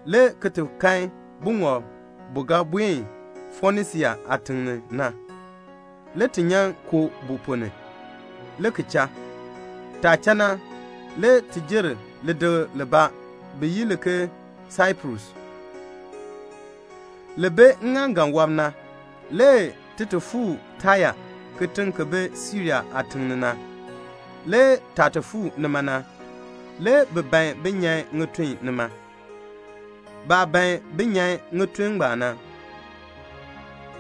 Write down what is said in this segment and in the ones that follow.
le ki ti kan buŋɔb bu ga buen Fonisia aatiŋ ni na. Le ti nyan koo bu ponn ni, le ki cha. Taah cha na, le ti jer lidikl libaa bi yi li ke Saiprus, li bi ŋŋaaŋgan wɔb na, le ki ti fuu Taya, kitiŋ ki bi Siria aatiŋ ni na. Le taah ti fuu nima na, le bi ban bin nyan ŋitun nima. Baah ban bin nyan ŋitun ngbaan na,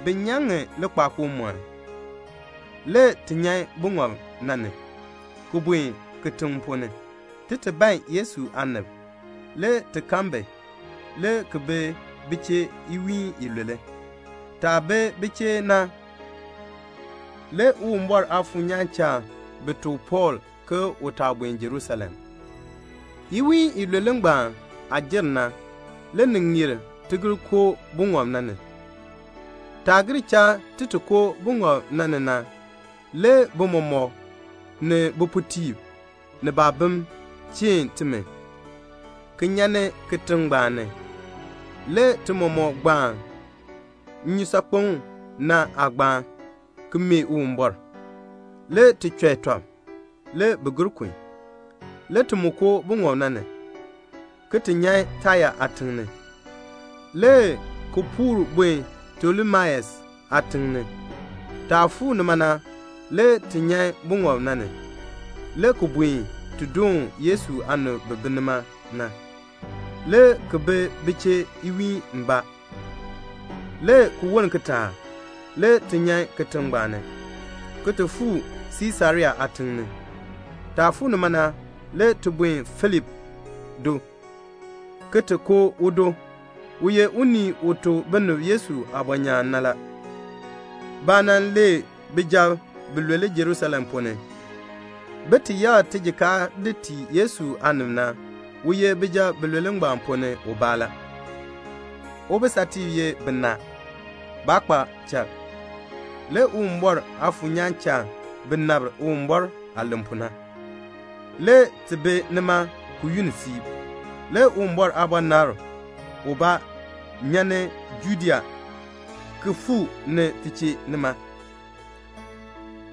bi nyan ŋi likpakool mɔn. Le ti nyan buŋɔb na ni, ki buen kitiŋ ponn ni, ti ti ban Yesu aanib. Le ti kan bi, le ki bi bi chee iwiin ilule. Taah bi bi chee na, le Uwumbɔr Aafuur nyaan cha bi tuk Pɔɔl ke u taa buen Jerusalem. Iwiin ilule ngbaan aah jer na, le ni ŋeer ti gir koo buŋɔb na ni. Taah gir cha ti ti koo buŋɔb ni na le bi mɔmɔk, ni bipuutiib ni baabim, cheen timi, ki nyan ni kitiŋ ngbaan ni. Le ti mɔmɔk gbaan nnyusaakpem na aagbaan, ki mee Uwumbɔr. Le ti chɔi tɔb. Le bi gir kun. Le ti mu koo buŋɔb na ni, ki ti nyan Taya aatiŋ ni, le ki puur buen Tolemais aatiŋ ni. Taah fuu nima na, le ti nyan buŋɔb na ni, le ki buen ti doon Yesu aanib bi bi nima na, le ki bi bi chee nwiin mbaa. Le ki woln kitaak, le ti nyan kitiŋ ngbaan ni, ki ti fuu Siisarea aatiŋ ni. Taah fuu nima na, le ti buen Filip do, ki ti koo udo. U ye unii u tuk binib Yesu aabɔnyaan na la. Baah nan lee bijab bilule Jerusalem ponn ni, bin ti yakr tijikaar di tii Yesu aanib na, u ye bijab bilule ngbaan ponn ni ubaa la. Ubisatiib ye binaa. Baa kpa chal. Le Uwumbɔr Aafuur nyaan cha bi nabr Uwumbɔr aah len pu na. Le ti bi nima ki yunn siib. Le Uwumbɔr aabɔnabr ubaa nyan ni Judea ki fuu ni ti chee nima,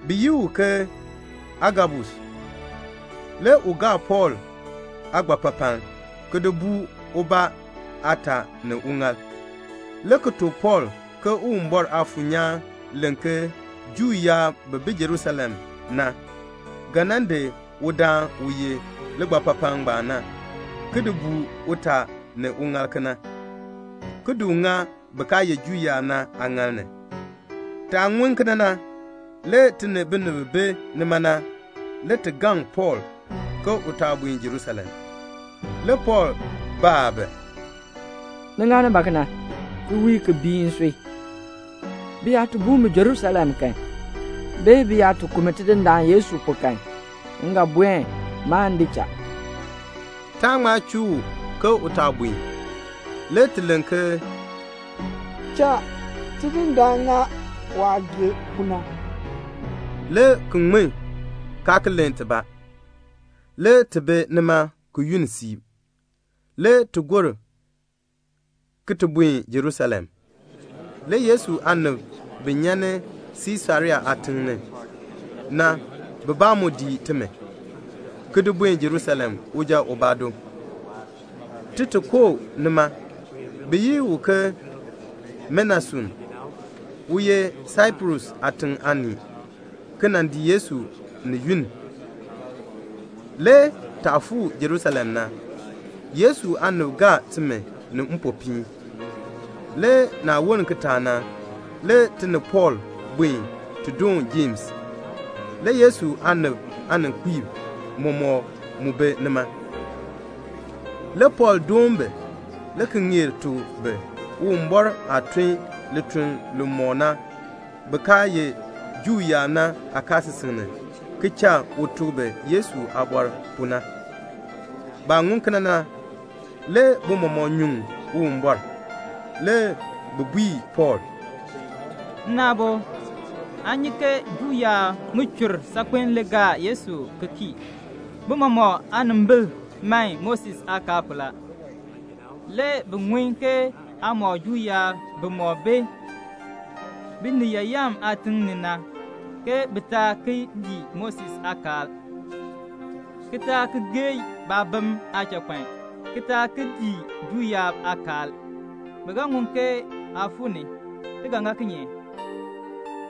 bi yi u ke Agabus. Le u gaa Pɔɔl aagbapapaln, ki di buu ubaa aataa ni uŋaal, le ki tuk Pɔɔl ke Uwumbɔr Aafuur nyaan len ke Juu yaab bi bi Jerusalem na, ga nan di udaan u yeh ligbapapaln ngbaan na ki di buu utaa ni uŋaal kena, ki di u ŋa bin kaa ye Juu yaab na aaŋaal ni. Taah ŋun kena na, le ti ni binib bi bi nima na, le ti gaŋ Pɔɔl ke u taa buen Jerusalem. Le Pɔɔl baa bi, "Ni ŋani ba kena, ki wii, ki bii nsui? Bi yaa ti buu mi Jerusalem kan, bee bi yaa ti ku mi Tidindaan Yesu pu kan, m ga buen. Maan di cha." Taa ŋma chuu u ke u taa buen. Le ti len ke, "Cha Tidindaan ŋa waah gee pu na," le ki ŋmin, kaa ki len tibaa. Le ti bi nima ki yunn siib. Le ti gor ki ti buen Jerusalem. Le Yesu aanib bi nyan ni Siisarea aatiŋ ni na bibaa mu dii timi, ki di buen Jerusalem uja ubaa do, ti ti koo nima. Bi yi u ke Menason, u ye Saiprus aatiŋ aanii, ki nan dii Yesu ni yunn. Le taah fuu Jerusalem na, Yesu aanib gaa timi ni mpopiin. Le naah woln kitaak na, le ti ni Pɔɔl buen ti ti doon Jems. Le Yesu aanib aaninkpiib mɔmɔk mu bi nima. Le Pɔɔl doon bi, le ki ŋeer tuk bi Uwumbɔr aah tun lituln li mɔk na bin kaa ye Juu yaab na aakaasisik ni, ki cha u tuk bi Yesu aabɔr pu na. Baah ŋun kena na, le bi mɔmɔk nyuŋ Uwumbɔr. Le bi bui Pɔɔl, "Nna aabo, aa nyi ke Juu yaab ŋichur saakpen le gaa Yesu ki kii. Bi mɔmɔk aanimbil man Moses aakaal pu la. Le bi ŋun ke aa mɔk Juu yaab bimɔk bi Biniyaayam aatim ni na ke bi taa ki dii Moses aakaal, ki taa ki geei baabim aachakpan, ki taa ki dii Juu yaab aakaal. Bi ga ŋun ke aa fuu ni. Ti ga ŋa kinye?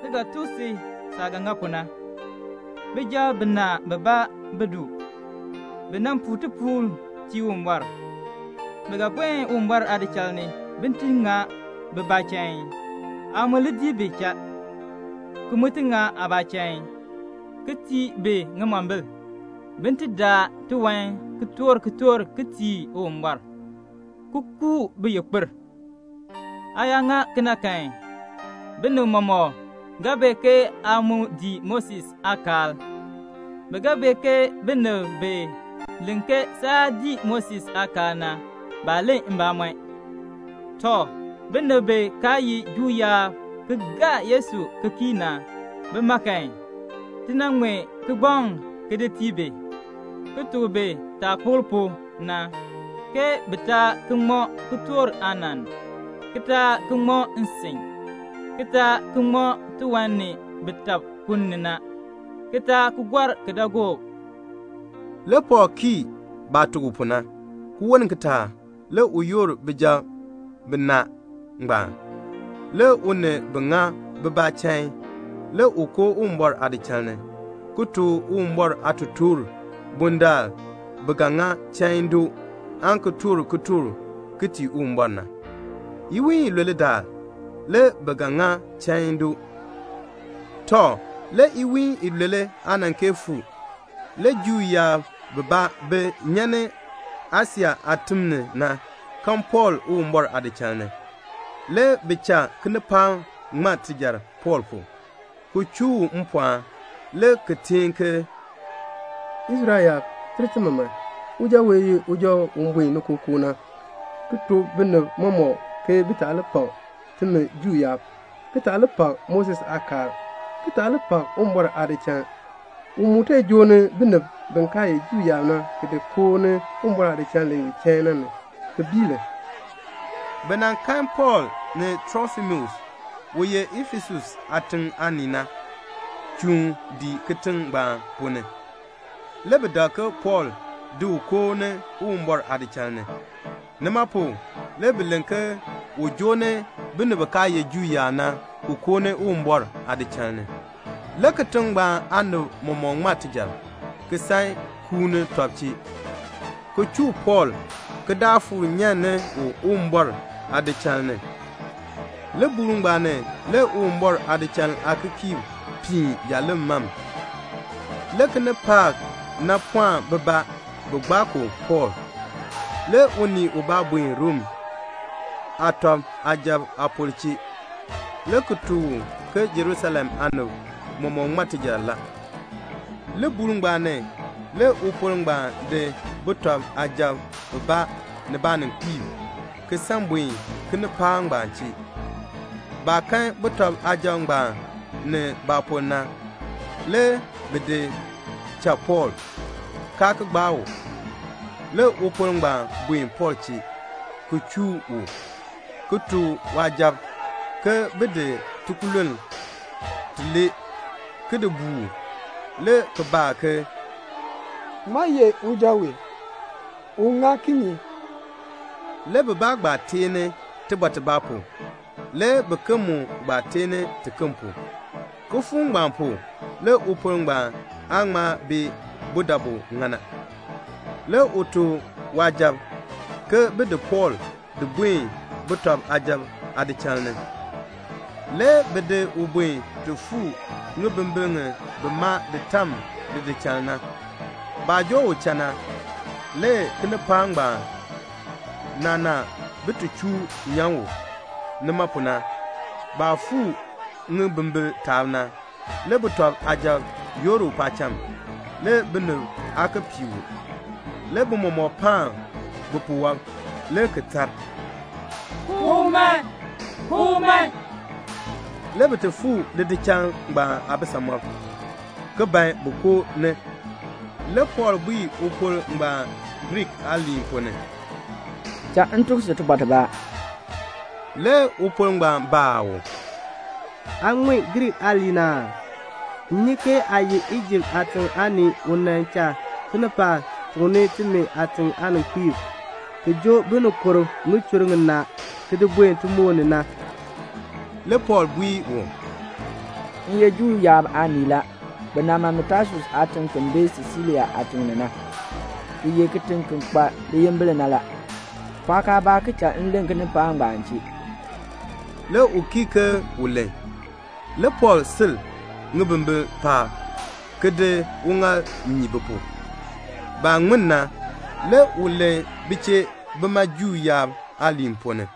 Ti ga tuk si saah ga ŋa pu na. Bijab binaa bibaa bi du. Bi nan puu tipuul tii Uwumbɔr. Bi ga buen Uwumbɔr aadichal ni, bin ti ŋa bibaa chain. Aa mu li dii bi cha, ki mu ti ŋa aabaa chain, ki tii bi ŋimombil, bin ti daa tiwan ki toor kitork ki tii Uwumbɔr, ki kuu baayikpir. Aa yaa ŋa kena kan, binib mɔmɔk ga bee ke aa mu dii Moses aakaal. Bi ga bee ke binib bi len ke saa dii Moses aakaal na, baa len mbamɔn. Tɔ, binib bi kaa ye Juu yaab ki gaa Yesu ki kii na, bima kan, ti nan ŋmee kigbaŋ ki di tii bi, ki tuk bi taah kpokl pu na, ke bi taa ki ŋmɔ kitork aanann, ki taa ki ŋmɔ nsin, ki taa ki ŋmɔ tiwan ni bi tab ku ni na, ki taa ki gɔr kidaagook." Le Pɔɔl kii baah tuk u pu na. Ki woln kitaak le u yoor bijab binaa ngbaan, le u ni bi ŋa bibaa chain. Le u koo Uwumbɔr aadichal ni, ki tuk Uwumbɔr aatotoor bundaln bi ga ŋa chain doo aan ki toor kitork ki tii Uwumbɔr na. Iwiin ilule daal, le bi ga ŋa chain doo. Tɔ, le iwiin ilule aa nan kee fuu. Le Juu yaab bibaa bi nyan ni Asia aatim ni na kan Pɔɔl Uwumbɔr aadichal ni. Le bi cha kinipaak ŋma tijar Pɔɔl pu, ki chuu u mpɔɔn, le ki teen ke, "Israel yaab, ter timi man. Uja wee, u ye uja u buen ni kookoo na, ki tuk binib mɔmɔk ke bi taa li pak timi Juu yaab, ki taa li pak Moses aakaal, ki taa li pak Uwumbɔr aadichal. U mu joo ni binib bi kaa ye Juu yaab na, ki di koo ni Uwumbɔr aadichal li ye chain na ni, ki bii li." (Bi nan kan Pɔɔl ni Trofimus, u ye Efesus aatiŋ aanii na, chuun dii kitiŋ ngbaan ponn ni. Le bi dak ke Pɔɔl di u koo ni Uwumbɔr aadichal ni. Nima pu le bi len ke u joo ni binib bi kaa ye Juu yaab na ki koo ni Uwumbɔr aadichal ni.) Le kitiŋ ngbaan aanib mɔmɔk ŋma tijar, ki san kuuni tɔb chee, ki chuu Pɔɔl ki daa fuur nyan ni Uwumbɔr aadichal ni. Libuul ngbaan ni le Uwumbɔr aadichal aakikiirb piin jaaleŋ mam. Le kinipaak na pɔɔn bibaa bi gbaa ku Pɔɔl. Le unii ubaa buen Rom sujatiib aapor chee, le ki tuk u ke Jerusalem aanib mɔmɔk ŋma tijar la. Libuul ngbaan ni le upor ngbaan di sujatiib bibaa ni baaninkpiib, ki san buen kinipaak ngbaan chee. Baah kan sujatiib ngbaan ni baapor na, le bi di cha Pɔɔl, kaa ki gbaa u. Le upor ngbaan buen Pɔɔl chee, ki chuu u, ki tuk waasujatiib ke bin di tikululn tilee ki di buu u, le ki baa ke, "Ŋmaa ye uja wee? U ŋa kinye?" Le bibaa gbaa teeni tibɔr tibaa pu, le biken mu gbaa teeni tiken pu. Kifuuk ngbaan pu, le upor ngbaan aa ŋma bee budabu ŋa na. Le u tuk waasujatiib ke bin di Pɔɔl di buen sujatiib aadichal ni. Le bi di u buen ti fuu ŋibimbir ŋi bi maa di tam lidichal na. Baah joo u cha na, le kinipaak ngbaan naanaa bin ti chuu nyan u. Nima pu na, baah fuu ŋibimbir taab na, le sujatiib yoor u paacham, le binib aa ki pii u. Le bi mɔmɔk paan bipuwɔb le ki tar, "Ku u man." Le bi ti fuu lidichal ngbaan aabisamɔb, ki ban bin koo ni. Le Pɔɔl bui upor ngbaan Griik aaliin ponn ni, "Cha m tuk si tibɔr tibaa." Le upor ngbaan baa u, "Aa ŋun Griik aaliin aa? M nyi ke aa ye Ijipt aatiŋ aanii u nan cha kinipaak tukni timi aatiŋ aaninkpiib, ki joo binikurb ŋichur ŋinaa ki di buen timoor ni na." Le Pɔɔl bui u, "M ye Juu yaab aanii la. Bi nan ma mi Tasus aatiŋ ki bi Silisia aatiŋ ni na, ki ye kitiŋ ki kpa liyimbil na la. Pɔɔk aabaa ki cha m len kinipaak ngbaan chee." Le u kii ke u len. Le Pɔɔl sil ŋibimbir paab, ki di uŋaal nyii bi pu. Baah ŋmin na, le u len bi chee bima Juu yaab aaliin ponn ni.